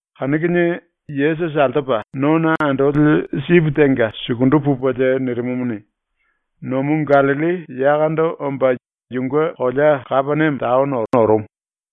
Kanu kinie Yesusi altopa nona andoli sipi tenga sukundu pupelie nirimumuni, nomu ⸤Gallilli⸥ yakondo omba yunge kolea ⸤Kapeniame taono⸥ orumu.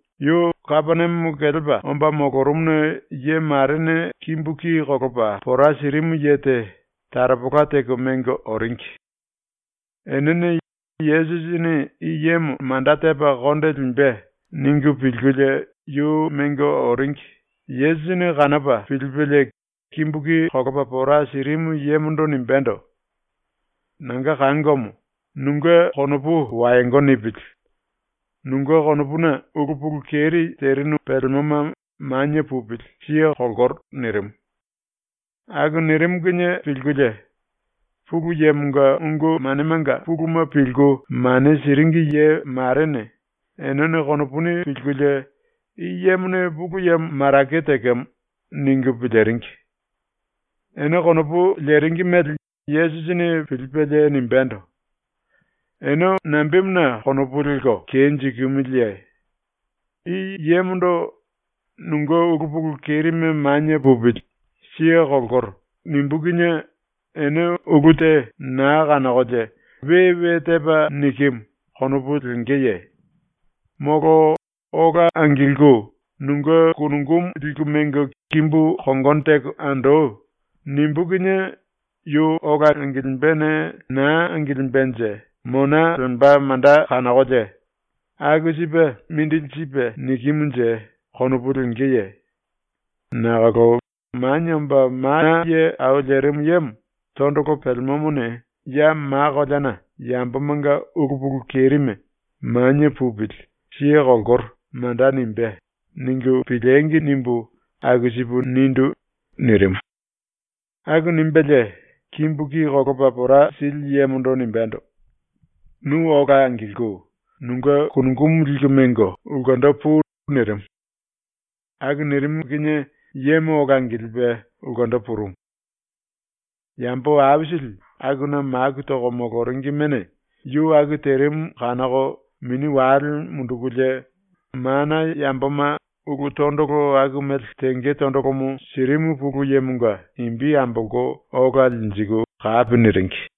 Yu ⸤Kapeniame kelepa⸥ omba molorumuna ye marene kimbu ki kolopa pora sirimu ye te taropola teko mengo oringi. Enene ‘Yesusini i yemo manda tepa konde limbe.’ ningu pilkulie yu mengo oringi, Yesusini kanopa pilipelie kimbu ki kolopa pora sirimu yemondo nimbendo: “Nanga kangomo, nunge konopu wayongo nipili. Nunge konopuna ulu pulu keri terinu pelemoma manie pupili, siye kolkoro.” nirimu. Aku nirimu kinie pilkulie Pulu Yemonga ungu manemanga puluma pilku mane siringi ye marene eneno konopuni pilkulie, ‘I yemone Pulu Yemo marake tekemo.’ ningu piliringi. Ene konopu leringi mele Yesusini pilipelie nimbendo: “Ene nambemuna konopu lelko kenjikimiliye? I yemondo “Nunge ulu pulu kerime manie pupili, siye kolkoro.” nimbú kinie ene ulu te naa kanokolie ‘We we tepa nikimu.’ konopu lengeye? Molo “Ola angilku nunge kunungumu liku mengo kimbu kongono teko andoi.” nimbú kinie yu ola angilimbene naa angilimbenje mona lemba manda kanokolie ‘Aku sipe mindili sipe nikimunje?’ konopu lengeye? Nakolo ‘ ‘Manie Omba Mana Ye Au Lerimu Yemo tondolo pelemomone ya ma koleana yambomanga ulu pulu kerime “Manie pupili, siye kolkoro.” manda nimbé.’ ningu piliengi!’ nimbu aku sipu nindu.” nirimu. Aku nimbelie kimbu ki kolopa pora sili yemondo nimbendo: “Nu ola angilku nunge kunungumu liku mengo ulkendo pui.” nirimu. Aku nirimu kinie yemo ola angilipe ulkendo purumu. Yambo aisili akuna maku toko moloringimene yu aku terimu kanoko mini wale mundukulie, mana yamboma ulu tondolo aku mele tenge tondolomo sirimu Pulu Yemonga imbi ambolko ola linjiku kapi niringi.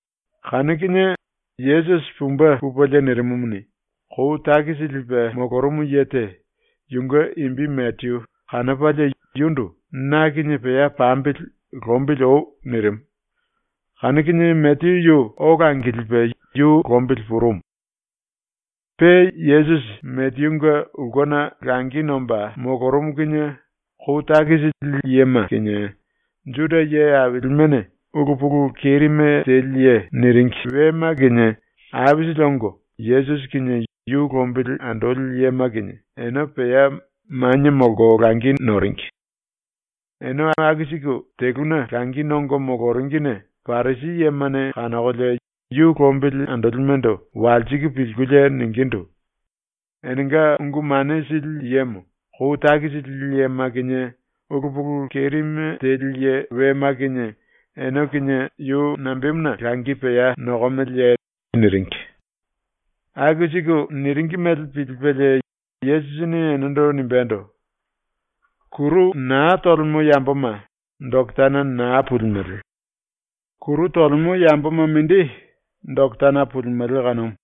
Kanu kinie Yesusi pumbe pupelie nirimumuni, kou takisi lipe molorumu ye te, yunge imbi Mateyu, kanopalie yundu “Na kinie pea pambili lombili oi.” nirimu. Kanu kinie Mateyu yu ola angilipe yu lombili purumu. Pe Yesusi Mateyunge ulkena langi nomba molorumu kinie kou takisi lili yema kinie, ⸤Juda ye ailimene⸥ “ulu pulu kerime teli ye” ⸤niringi⸥ wema kinie aisili ongo Yesusi kinie yu lombili andoli yema kinie ene pea manie molko langi noringi. ⸤Ene aku siku teluna langi nongo moloringine⸥ Parisi yemane kanokolie yu lombili andolimendo walsiku pilkulie ningindu: “Enenga ungu mane sili yemo kou takisi lili yema kinie ulu pulu kerime teli ye wema kinie ene kinie yu nambemuna langi pea nokomeleye?” niringi. Aku siku niringi mele pilipelie Yesusini enendo nimbendo: “Kuru naa tolemo yamboma doketana naa pulimele. Kuru tolemo yamboma mindi doketana pulimele kanumu.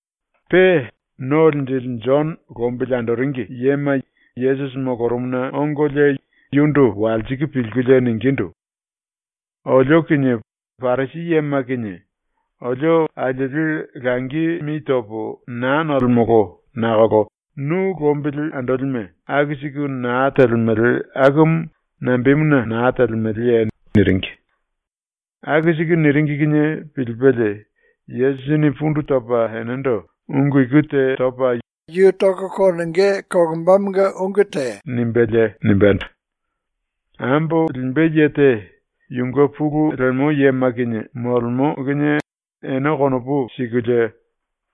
Pe ⸤No Linjili⸥ Jono lombili andoringi yema Yesusi molorumuna ongolie yundu walsiku pilkulie ningindu: “Olio kinie Parisi yema kinie olio alieli langi mi topo naa nolemolo nakolo nu lombili andolime aku siku naa telemele akumu nambemuna na telemeleye?” niringi. ⸤Aku siku niringi kinie pilipelie⸥ Yesusini pundu topa enendo ⸤ungu iku te topa yu kinie ulu te wendo ombá mele nimbelie⸥ nimbendo: “Ambo limbe ye te yunge pulu lemo yema kinie molemo kinie ene konopu sikulie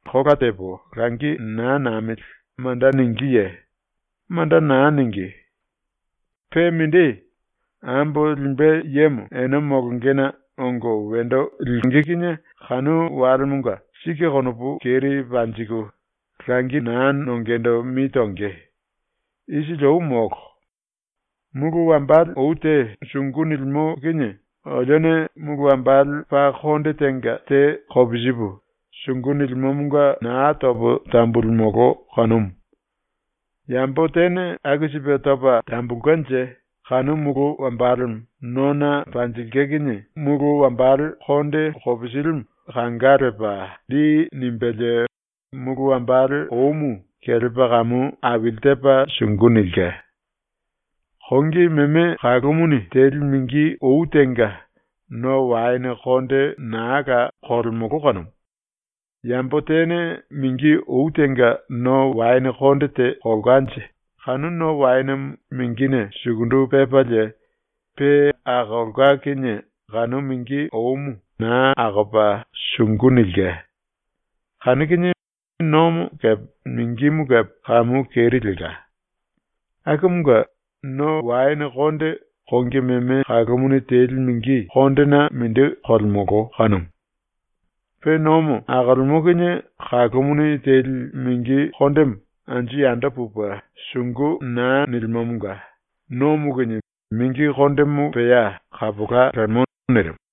“Kola tepo langi naa namili.” manda ningíye? Manda na ningí. Pe mindi, ambo limbe yemo ene molongena ongo wendo liku ⸤tonge⸥ kinie kanu walemanga sike ⸤konopu keri panjiku⸥ langi naa nongendo mi tonge. ⸤Isili ou molo.⸥ “Mulu wambale ou te sungu nilimo kinie olione mulu wambale paa konde tenga te kopisipu lipu, sungu nilimomonga naa topo tambululimolo kanumu. Yambo tene aku sipe topa tambulkenje kanu mulu wambalemo nona panjilke kinie mulu wambale konde kopisilimu kanga lepa lli nimbelie mulu wambale oumu kelepa kamu aili tepa sungu nilke. “Kongi meme kalumuni teli mingi ou tenga no waene konde naa la kolemolo kanumu. Yambo tene mingi ou tenga no waene konde te kolkanje kanu no waenemo mingine sukundu pepalie pe akolka kinie kanu mingi oumu naa akopa sungu nilke. Kanu kinie nomo kepe mingimu kepe kamu keri lelka. Akumunge no waene konde kongi meme kalumuni teli mingi kondena mindi kolemolo kanumu. ⸤Pe nomo akolemo kinie kalumuni teli mingi kondemo anju yando pupe sungu naa nilimomonga⸥ nomo kinie mingi kondemo pea kapola lemo.” nirimu.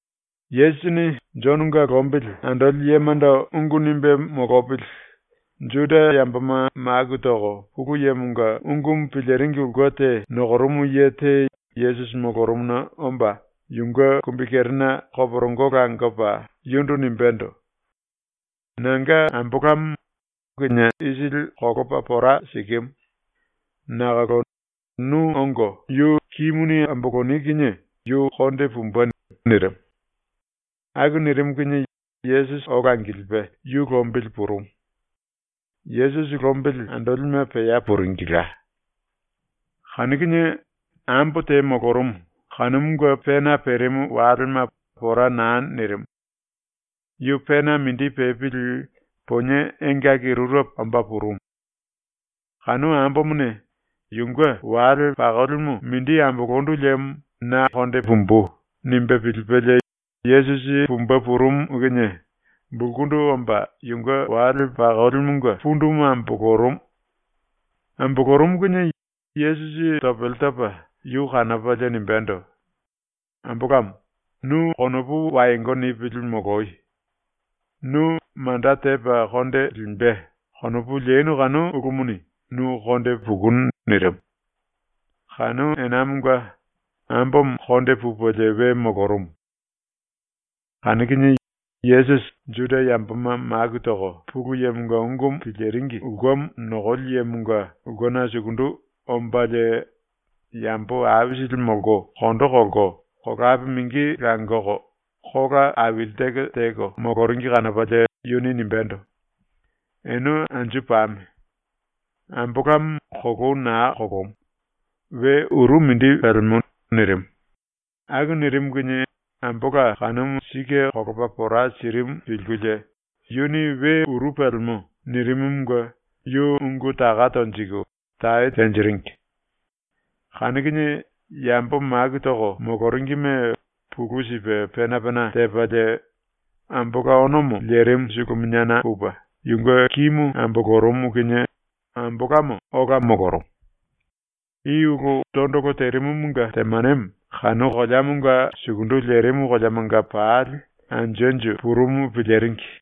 Yesusini Jononga lombili andoli yemando ungu nimbe molopili ⸤Juda yamboma maku toko Pulu Yemonga ungumu piliringi ulke te⸥ nokorumu ye te Yesusi molorumuna omba yunge kumbikerena koporongo langopa yundu nimbendo: “Nanga ambolamo kinié isili kolopa pora sikimu. Nakolo nu ongo yu kimuni amboloni kinie yu konde pumbe.” nirimu. Aku nirimu kinie Yesusi ola angilipe yu lombili purumu. Yesusi lombili andolime pea puringila. Kanu kinie ambo te molorumu kanumunge pena perimu walema pora na nirimu. Yu pena mindi pepili ponie engaki rurepo omba purumu. Kanu ambomone ‘Yunge wale pakolimu mindi ambolondu liemo na konde pumbu.’ nimbe pilipelie Yesusi pumbe purumu kinie bulkundu omba, yunge wale pakolimunge pundumu ambolorumu. Ambolorumu kinie Yesusi topele topa yu kanopalie nimbendo: “Ambolamo, nu konopu wayongo nipili moloyo. ‘Nu manda tepa konde limbe.’ konopu lenu kanu ulumuni nu konde pukunu.” nirimu. Kanu enamonga ambomo konde pupelie we molorumu. Kanu kinie Yesusi ⸤Juda yamboma maku toko Pulu Yemonga ungumu piliringi ulkemo⸥ nokoli yemonga ulkena sukundu ombalie yambo aisili molko kondo kolko, kolape mingi langoko, kola aili teko teko moloringi kanopalie yuni nimbendo: “Ene anju pame! Ambolamo kolou na kolomu. We uru mindi pelemo.” nirimu. Aku nirimu kinie ⸤ambola kanumu sike kolopa pora sirimu pilkulie yuni “We uru pelemo.” nirimumunge⸥ yu ungu taka tonjiku tae tenjiringi. Kanu kinie yambo maku toko moloringime pulu sipe pena pena tepalie ⸤ambola onomo lerimu⸥ suluminiana pupe yunge kimu ambolorumu kinie ambolamo ola molorumu. I ulu tondolo terimumunge temanemo kanu koleamonga sukundu lerimu koleamanga pali anju anju purumu piliringi.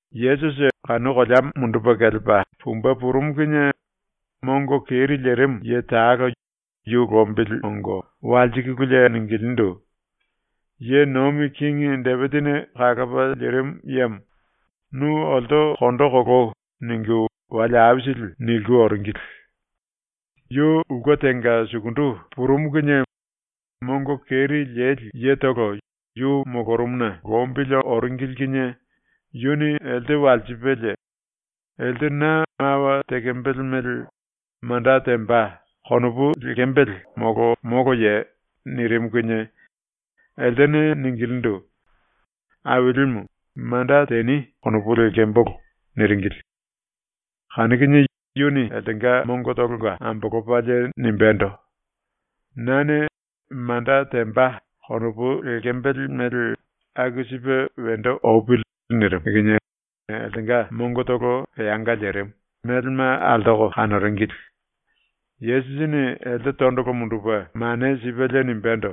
Yesusi kanu koleamo mundupe kelepa pumbe purumu kinie mongo keri lerimu ye talo yu lombili ongo walsikululie ningilindu: “Ye nomi kingi Depisini kalopa lirimu yemo, nu olto kondo koloi.” ningu wale aisili niliku oringili. Yu ulke tenga sukundu purumu kinie mongo keri leli yetolo yu molorumuna lombili oringili kinie yuni elte walsipelie: “Elte na mawa tekembele mele ‘Manda temba.’ konopu lekembele molo moloye?” nirimu kinie eltene ningilindu: “Ailimu, ‘Manda teni.’ konopu lekembolo.” niringili. Kanu kinie yuni eltenga mongotolonga ambolopalie nimbendo: “Nane ‘manda temba.’ konopu lekembele mele aku sipe wendo opili.” nirimu kinie eltenga mongotolo peanga lerimu, melema altoko kanoringili. Yesusini elte tondolo mundupe mane sipelie nimbendo: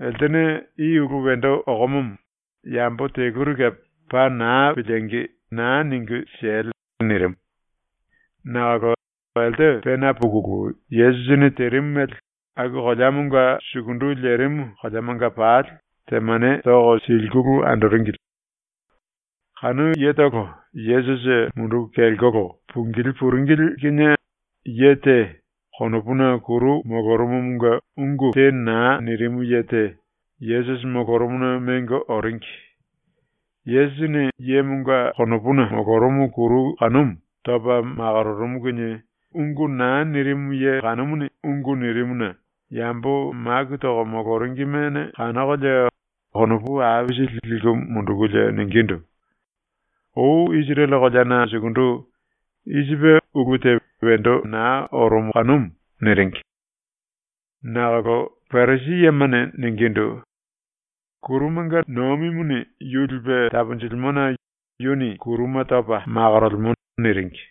“Eltene i ulu wendo okomomo yambo teluri kepe paa naa piliengi, naa ningu siele!” nirimu. Nakolo elte pena pukulu Yesusini terimu mele aku koleamonga sukundu lerimu koleamanga pali temane toko silikulu andoringili. Kanu yetolo Yesusi munduku kelkolo pungilí puringili kinie ye te konopuna kuru molorumumunge ungu te naa nirimu ye te Yesusi molorumuna mengo oringi. Yesusini yemonga konopuna molorumu kuru kanumu topa makororumu kinie ungu naa nirimu ye kanumuni ungu nirimuna yambo maku toko moloringimene kanokolie konopu aisili liku mundukulie ningindu: “Ou Isirele koleana sukundu i sipe ulu te wendo na orumu kanumu.” niringi. Nakolo Parisi yemane ningindu: “Kurumanga nomimuni yu lipe taponjilimona yuni kuruma topa makorolemo.” niringi.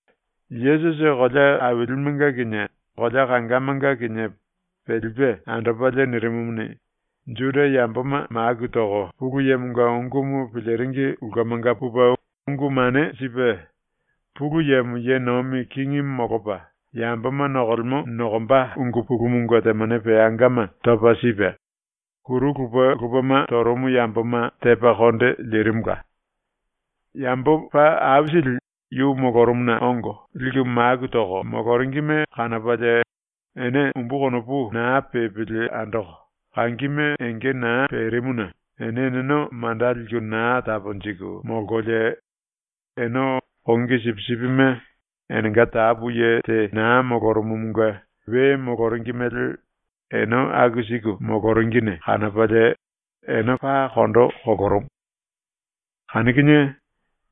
Yesusi kolea ailimenga kinie, kolea kangamanga kinie pelipe andopalie nirimumuni, Juda yamboma maku toko Pulu Yemonga ungumu piliringi ulkemanga pupe ungu mane sipe; Pulu Yemo ye nomi kingi molopa yamboma nokolemo nokomba ungu pulumunge temane peangama topa sipe; kuru lupe lupema torumu yamboma tepa konde lirimula. Yambo paa aisili yu molorumuna ongo liku maku toko moloringime kanopalie ene umbu konopu naa pepili andoko, kangime enge naa perimuna ene eneno manda liku na taponjiku molkolie ene kongi sipisipime enenga tapu ye te na molorumumunge we moloringi mele ene aku siku moloringine kanopalie ene paa kondo kolorumu. Kanu kinie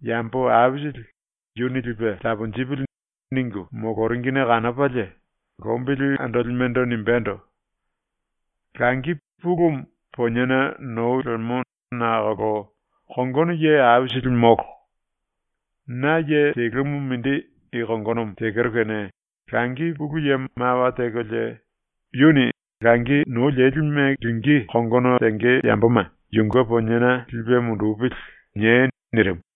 ⸤yambo aisili ‘Yuni lipe taponjipili.’ ningu moloringine kanopalie⸥ lombili andolimendo nimbendo: “Langi pulumu poniena nou lemo nakolo kongono ye aisili molo. ⸤Na ye telumu mindi i kongonomo tekero kene⸥ Langi Pulu Yemo mawa tekolie yuni “Langi nou lelime lingí kongono tenge yamboma yunge poniena lipe mundupili.” niei.” nirimu.